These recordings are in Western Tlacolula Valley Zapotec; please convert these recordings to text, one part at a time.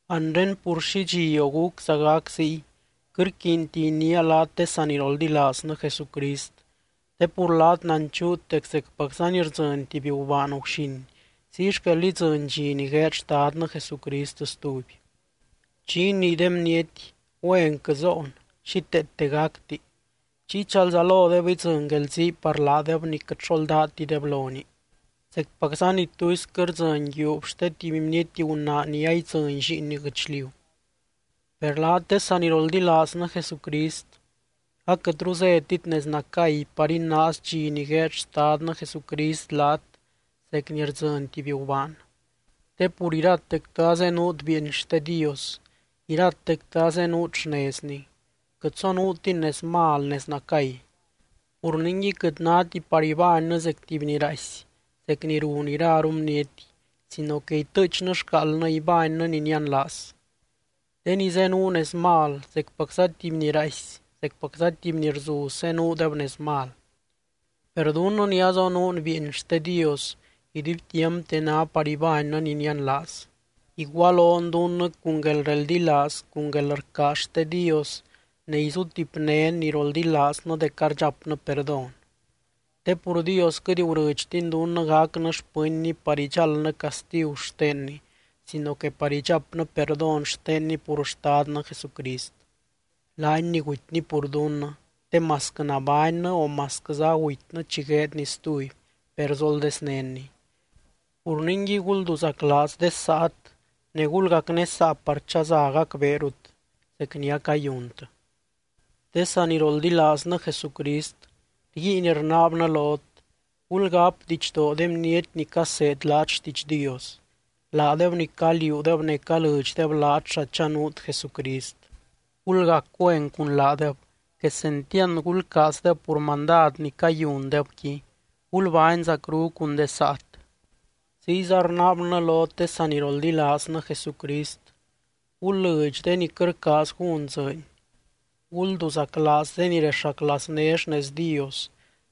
Anre pur xi dxi o gúcza gac ziy, quɨt rquiinti iniia laat de saniroldilaaznɨ Jesucrist. Te pur laat nanchuut dec zecpacza ni rdzɨny tuby gubaan guxin, ziy xquel idzɨny dxi ni gueed Xtadnɨ Jesucrist stuby. Chi inii de bniety: “Güenquɨ zoon, xíteete gacti”, chiy chalzalodeb idzɨny guelzii par laadeb ni quɨt xo ldátideb lonii, zecpacza ni tuisquɨ rdzɨny yiuub xte tuby bniety gunaa ni aidzɨny lliinni guɨchliu. Per laat de saniroldilaaznɨ Jesucrist, aquɨtru zétit nez nacay par inaaz dxi ni gueed Xtadnɨ Jesucrist laat zec ni rdzɨny tuby gubaan. Te pur iratectɨ azenuut bieeny xte Dios, iratectɨ azenuut xnezny. Quɨt zonuutin nez mal, nez nacay. Pur ningui quɨt náti par ibánnɨ zec tuby ni raaisy, zec ni run iraru bniety, sino que itɨɨchnɨ xcaaldnɨ, ibánnɨ ni nianlaaz. De ni zenuu nez mal, zecpacza tuby ni raaisy, zecpacza tuby ni rzuz zenuudeb nez mal. Per dunnɨ ni azonuun bieeny xte Dios, iduibtiampte ná par ibánnɨ ni nianlaaz. Igualon dunnɨ cun guelreldilaaz cun guelrcaaz xte Dios ne izutipnén ni roldilaaznɨ dec ardxapnɨ perdón. Te pur Dios quɨt gurɨdxtiny dunnɨ gacnɨ xpɨnny par idxáldnɨ castigu xtenny, sino que par idxapnɨ perdón xtenny pur Xtadnɨ Jesucrist, laany ni gutyny pur dunnɨ te masquɨ nabánnɨ o masquɨza agutynɨ chi gueedny stuby, per zoldeznénny. Pur ningui gulduzaclaaz de saat ne gulgacnésaa par chaza gacbeerut, zec ni acayuntɨ. De saniroldilaaznɨ Jesucrist, rguiin rnaabnɨ lot, gulgáp didxdoo de bniety ni caseed laat xtiidx Dios, laadeb ni caliuudeb ne calɨdxdeb laat xa chanuut Jesucrist. Gulgac güen cun laadeb, quesentiand gulcaazdeb pur mandad ni cayundebqui. Gulbány zacru cun de saat. Ziyza rnaabnɨ lot de saniroldilaaznɨ Jesucrist, gul lɨdx de ni quɨt rcaaz gún dzɨɨny, gulduzaclaaz de ni rexaclaazné xnez Dios,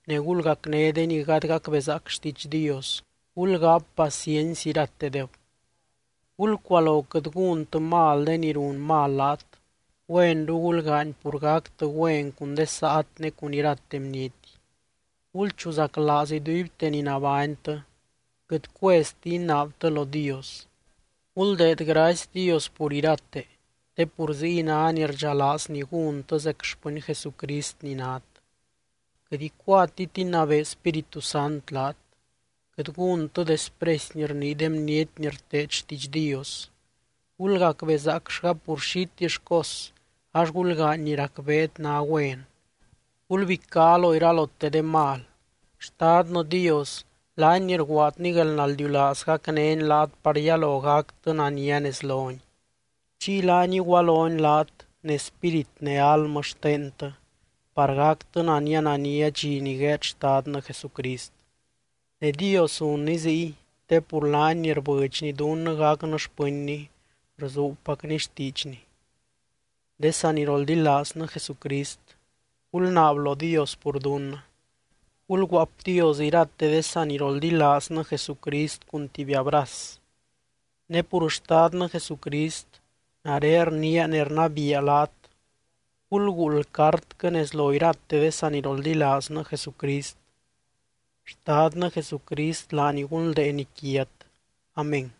ne gulgacné de ni gady gacbezaac xtiidx Dios, gulgáp paciency iratedeb. Gulcualo quɨt gúntɨ mal de ni run mal laat, güenru gulgaany pur gactɨ güen cun de saat ne cun irate bniety. Gulchuzaclaaz iduibte ni nabánytɨ. Quɨt cuezti inaabtɨ lo Dios. Guldeed gracy Dios pur irate, te pur ziy ná ni rdxalaazny gúntɨ zec xpɨny Jesucrist ni nát. Quɨt icuatit inabee Spíritu Sant laat. Quɨt gúntɨ despresy ni rnii de bniety ni rteed xtiidx Dios. Gulgacbezaacllga pur xitill cos, ax gulgaany ni racbeet ná güen. Gulbicá lo iralote de mal. Xtadnɨ Dios, laany ni rguaadny guelnaldiulaaz gacnény laat par yalo gactɨ nania nez lony. Chiy laany igualony laat ne spírit ne almɨ xtentɨ, par gactɨ nania nania dxi ni gueed Xtadnɨ Jesucrist. Ne Dios zunny ziy, te pur laany ni rbɨdxny dunnɨ gacnɨ xpɨnny, rzuubpacny xtiidxny. De saniroldilaaznɨ Jesucrist, gulnaab lo Dios pur dunnɨ. Gulguaapdios irate de saniroldilaaznɨ Jesucrist cun tuby abraz. Ne pur Xtadnɨ Jesucrist, nare rniia ne rnabiia laat: Gulguuld cartquɨ nez lo irate de saniroldilaaznɨ Jesucrist. Xtadnɨ Jesucrist, laany gunldeeny quiat. Amén.